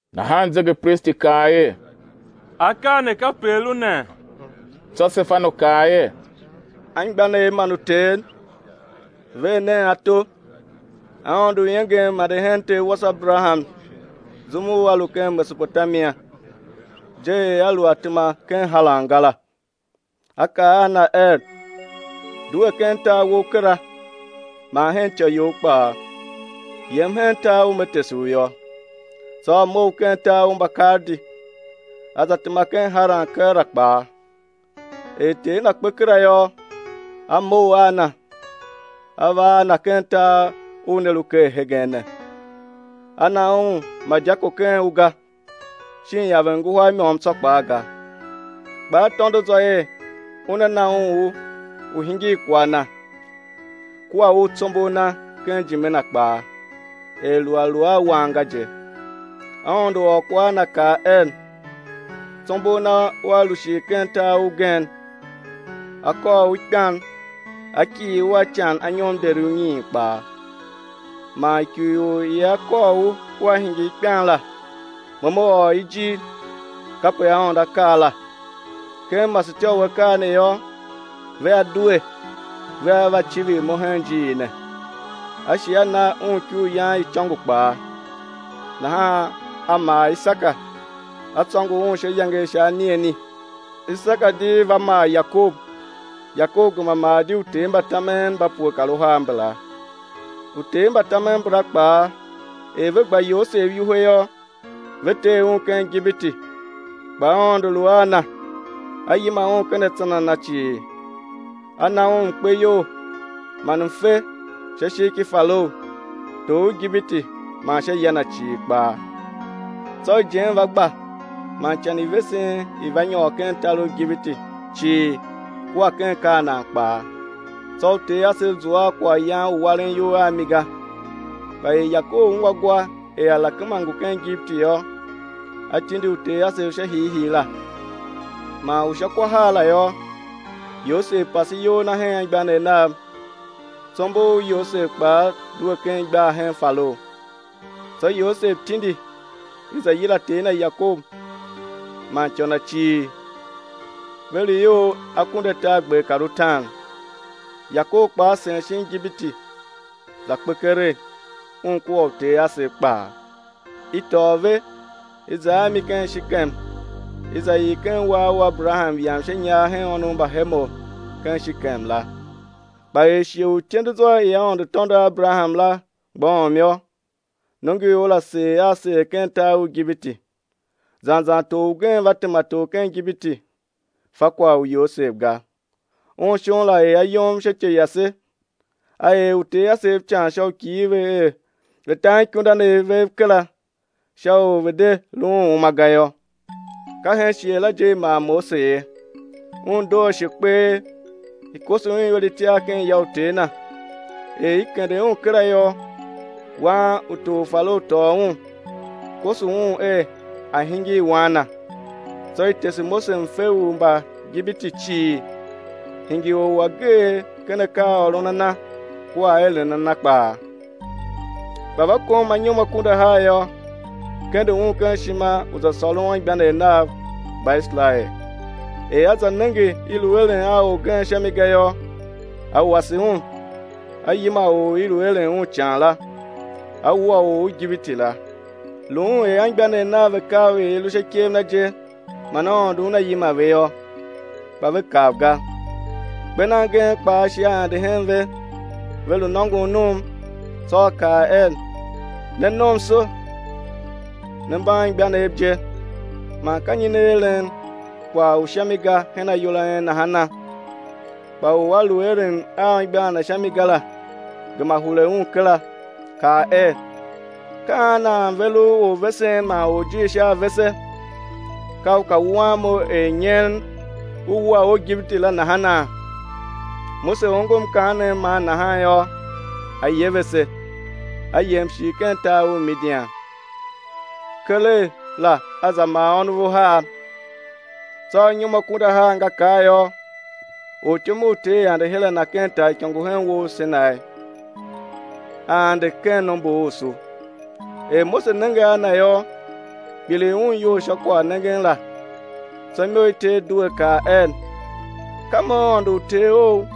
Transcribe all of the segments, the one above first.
Nahan zegepristi kaa er: Akaa ne kape a lu nee? Tsô Sefanu kaa er: Anmgbianev man uter, ver nen ato, Aôndo u iengem ande hen ter wase Aberaham zum u a lu ken Mesopotamia, je er a lu a tema ken Haran ga la. A kaa a na er: Due ken tar wou kera, man hen ityô you kpaa, yem hen tar u Me tese u yô. Tsô a mough ken tar u Mbakaldi, a za tema ken Haran; keela la kpaa, er ter na kpe kera yô, A mough a na, A va a na ken tar u ne lu ker hegen ne. A na un ma dyako ken u ga, shin iaven i nguhar i môm tsô kpaa ga; kpa A tôndo zwa er Una na un u u̱ hingir kwagh na kua u tsombor na ken ijime na kpaa, er lu a lu a wan ga je. Aôndo ôr kwagh, a na kaa er, tsombor na ua lu shir ken tar ugen, a kôr u ikpan, á kighir u a ican anyom deri unyiin kpaa. Man ikurior i ia kôr u ua hingir kpan la, Mo Me ôr i ijir, kape Aôndo A kaa la; ken masetyô u akaa ne yô, vea due, vea va civir Mo hen ijiir ne. A Shi A na un ikuryan i icôngo kpaa; nahan a mar Isaka, a tsôngo un sha iyange i sha anigheni. Isaka di va mar Yakob, Yakob gema mar di uter mba tamen mba pue kar uhar mbala. Uter mba tamen mbala kpaa, er ve gba Yosev iwuhe yô, ve tee un ken Igipiti; kpa Aôndo lu a na, A yima un ken atsan a na cii, A na un mkpeyol man mfe sha ishigh ki Farao, tor u Igipiti man sha ya na cii kpaa. Tsô ijen i va gba man ican i vesen i va nyôr ken tar u Igipiti cii kua ken Kanaan kpaa, tsô uter asev zua a kwaghyan u waren iyol a mi ga. Kpa er Yakob ungwa gwa er alakema ngu ken Igipiti yô, a tindi uter asev sha hiihii la. Man u sha kwa har la yô, Yosev pase iyol na hen anmgbianev nav, tsombor u Yosev kpaa due ken igbar hen Farao. Tsô Yosev tindi, i za yila ter na Yakob, man ityô na cii, ve lu ior akunduatargber kar utaan. Yakob kpaa sen shin Igipiti; za kpe keregh, un kua uter asev kpaa; i tôô ve, i za a mi ken Shekem, i za ii ken uwar u Aberaham yam sha inyar hen ônov mba Hemor ken Shekem la. Kpa er shighe u ityendezwa i Aôndo tôndo a Aberaham la mgbôghom yô, nongoior la seer a seer ken tar u Igipiti, zan zan tor ugen va tema tor ken Igipiti, fa kwagh u Yosev ga. Un shon la er ayom sha ityô yase, a er uter asev ican sha u kighir ve er ve̱ ta anikundanev vev kera, sha u ve̱ de lu uma ga yô. Ka hen shighe la je i mar Mose ye; un doo ashe kpee. I koso un iwer itiar ken ya u ter na. Er i kende un kera yô, wan u tor Farao tôô un, koso un er a̱ hingir wan na. Tsô i tese Mose mfe u Mbaigipiti cii, hingir or u ageegh ken akaaôron a na kua aeren a na kpaa. Kpa va kom anyom akunduahar yô, kende un ken ishima u za sôron anmgbianev nav, Mbaiserael. Er a za nenge i lu eren a orgen sha mi ga yô, a wase un, a yima or u i lu eren un ican la, a wua or u Igipiti la. Lu un er anmgbianev nav ve kav er i lu sha ikev na je man Aôndo Una yima ve yô, kpa ve kav ga. Kper nan gen kpaa shi a ande hen ve, ve lu nôngon num; tsô a kaa er: Ne nomso, ne mba anmgbianev je, man ka nyi ne eren kwagh u sha mi ga hen ayol a en nahana? Kpa u a lu eren a anmgbian na sha mi ga la, gema hure un kera, kaa er: Ka an nan ver u orvesen man orjir sha a vese? Ka u ka wuan mo er nyen u wua or u Igipiti la nahana? Mose ongo mkaanem man nahan yô, a yevese, a yem shir ken tar u Midian; keregh la a za mar ônov uhar. Tsô anyom akunduahar nga kar yô, ortyom u Ter ande her a na ken taaikôngo u hen uwo u Senai, a ande ken nomborusu. Er Mose nenge a na yô, kpiligh un iyol sha kwaghnengen la; tsô imo i Ter due kaa er: Ka Mo Aôndo u uter ou,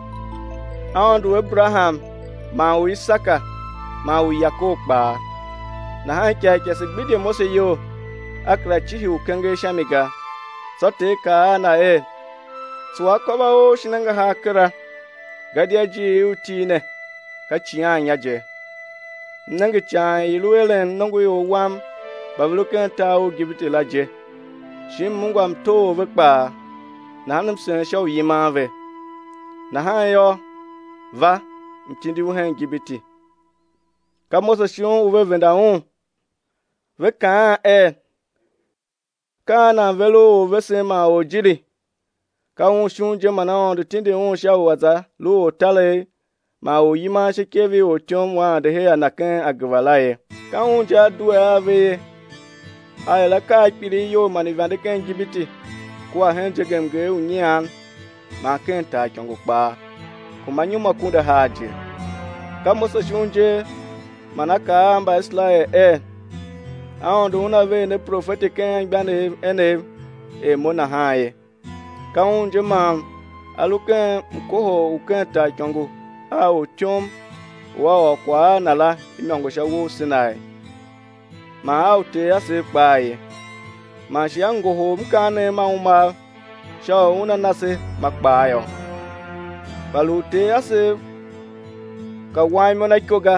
Aôndo u Aberaham man u Isaka man u Yakob kpaa. Nahan ikarikase gbidye Mose iyol, a kera cihi u kenger sha mi ga. Tsô Ter kaa a na er: Tsuwa akôv a ou shin angahar kera, gadia ijiir i u til ne, ka icighannya je. M nenge ican i lu eren nongoior Wam mba ve lu ken tar u Igipiti la je, shi M ungwa mtoghor ve kpaa, nahan M sen sha u yiman ve. Nahan yô, va, M̱ tindi u hen Igipiti. Ka Mose shon u ve venda un, ve kaan er: Ka an nan ver u orvesen man orjirighi? Ka un shon je man Aôndo tindi un sha u a̱ za lu ortaregh man oryiman sha ikev i ortyom u a ande her a na ken ageva la ye. Ka un je a due a ve ye, a er akaa a kpilighyol man uivande ken Igipiti kua hen zegemnger u Nyian man ken taaikôngo kpaa, kuma anyom akunduahar je. Ka Mose shon je man a kaa a Mbaiserael er: Aôndo Una ver ne profeti ken anmgbianev enev er mo nahan ye. Ka un je man a lu ken mkohol u ken taaikôngo a ortyom u a ôr kwagh a na la imôngo sha uwo u Senai, man a uter asev kpaa ye, man shi a ngohol mkaanem ma umam sha u una na se ma kpaa yô. Kpa lu uter asev ka wan imo na iko ga,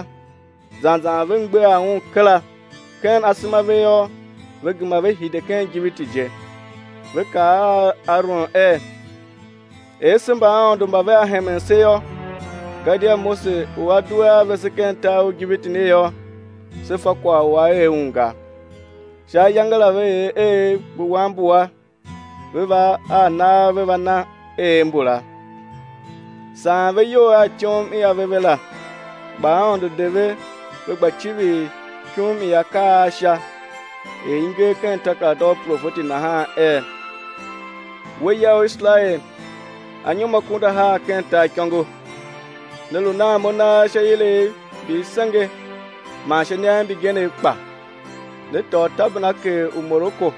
zan zan ve mgbegha un kera; ken asema a ve yô, ve gema ve hide ken Igipiti je; ve kaa a Aron er: Er se mbaaôndo mba vea hemen se yô; gadia Mose u a due a vese ken tar u Igipiti ne yô, se fa kwagh u a er un ga. Sha ayange la ve er eev mbu wanbua ve va a nagh ve va na eev mbula, saan ve iyol a ityom i ave a ve la. Kpa Aôndo de ve ve gba civir ikum i akaa a Sha, er i nger ken takerada u uprofeti nahan er: We ya u Iserael, anyom akunduahar ken taaikôngo, ne lu nan Mo nagh sha ilev mbi i senge man sha iniav mbigenev kpa? Ne tôô tabernakel u Moleki,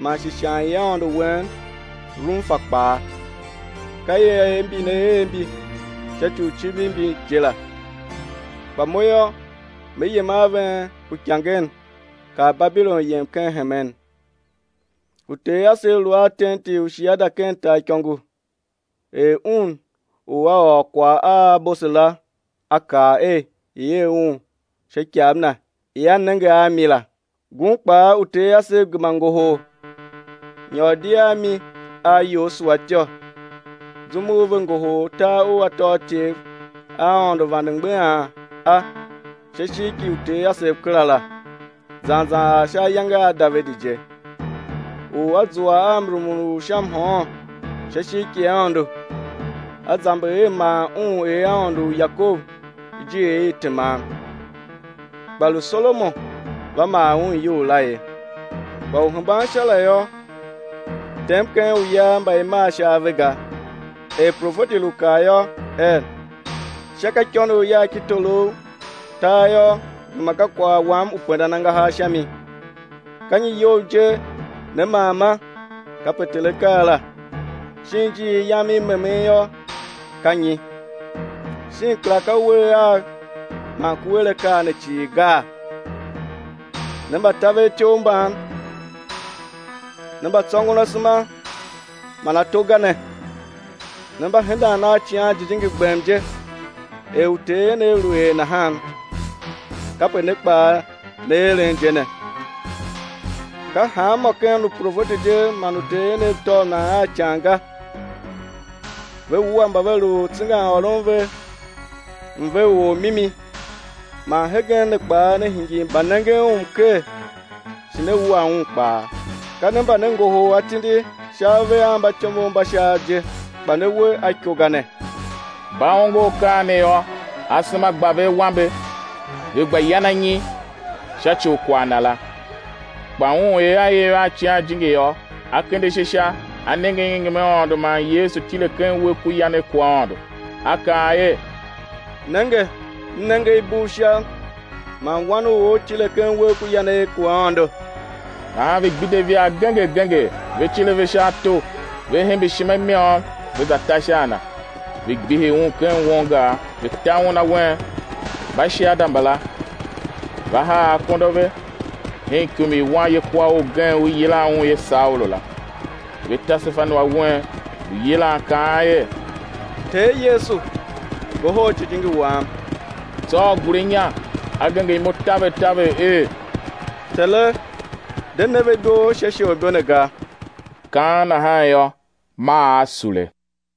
man shi ishan i aôndo wen Romfa kpaa, ka ieev mbi ne er mbi sha ci u civir mbi je la. Kpa Mo yô, Me yem a ven uikangen, kar Babilon yem ken hemen. Uter asev lu a tenti u shiada ken taaikôngo er Un u A ôr kwagh a Mose la A kaa er i̱ er un sha ikav na i a nenge a mi la. Ngun kpaa uter asev gema ngohol, nyôr di a mi a Yosua ityô, zum u ve ngohol tar u atôatyev a Aôndo vande mgbeghan a sha ishigh ki uter asev kera la, zan zan ar sha ayange a Davidi je, u a zua a mrumun u sha mhôôn sha ishigh ki Aôndo, a zamber er ma un er Aôndo, u Yakob ijiir i teman. Kpa lu Solomon va maa Un iyou la ye. Kpa Uhembansha la yô, tem ken uya mba i maa sha ave ga, er profeti lu kaa yô, er: Sha ka ikônough Yagh ki torough, tar yô, gema ka kwagh Wam u pendan angahar sha mi. Ka nyi iyou je né maama? Kape Ter A kaa la. Shin ijiir Yam i memen yô, ka nyi? Shin kera ka uwegh Agh man ku er akaa ne cii gaa? Ne mbatavertyough mban, ne mbatsôngon asema man ato ga ne, ne mba hendan a Icighan Jijingi gbem je; er uter enev lu er nahan, kape ne kpaa ne eren je ne. Ka hanmô ken uprofeti je man uter enev tôv nan a ican ga? Ve wua mba ve lu tsengan ôron mve u Ormimi, man hegen ne kpaa ne hingir mbanengen Un mker shi ne wua Un kpaa; ka ne mba ne ngohol atindi sha ave a mbatyomov mba Shaav je, kpa ne we a iko ga ne. Mba ongo akaa ne yô, asema gba ve awambe, ve gba yan anyi sha ci u kwagh na la. Kpa un, er a iv a Icighan Jijingi yô, a kende ashe Sha, a nenge iengem i Aôndo man Yesu tile ken uwegh ku yanegh ku Aôndo, a kaa er: Nenge, m nenge i bugh Sha man Wan u or tile ken uwegh ku yanegh ku Aôndo. Nahan ve gbidye ivaa genger genger, ve cir ave sha ato, ve hembe ishima i môm, ve za ta sha a na. Ve gbihi un ken won gar, ve ta un awen; mbashiada mbala va haa akondo a ve hen ikum i wanyekwaor ugen u i yilan un er Saulu la. Ve ta Sefanu awen, lu yilan kaan er: Ter Yesu, ngohol jijingi wam! Tsô a gure inya, a genger imo taver taver er: Tere, de ne ve ibo sha isholibo ne ga! Kaan nahan yô, maa a sule.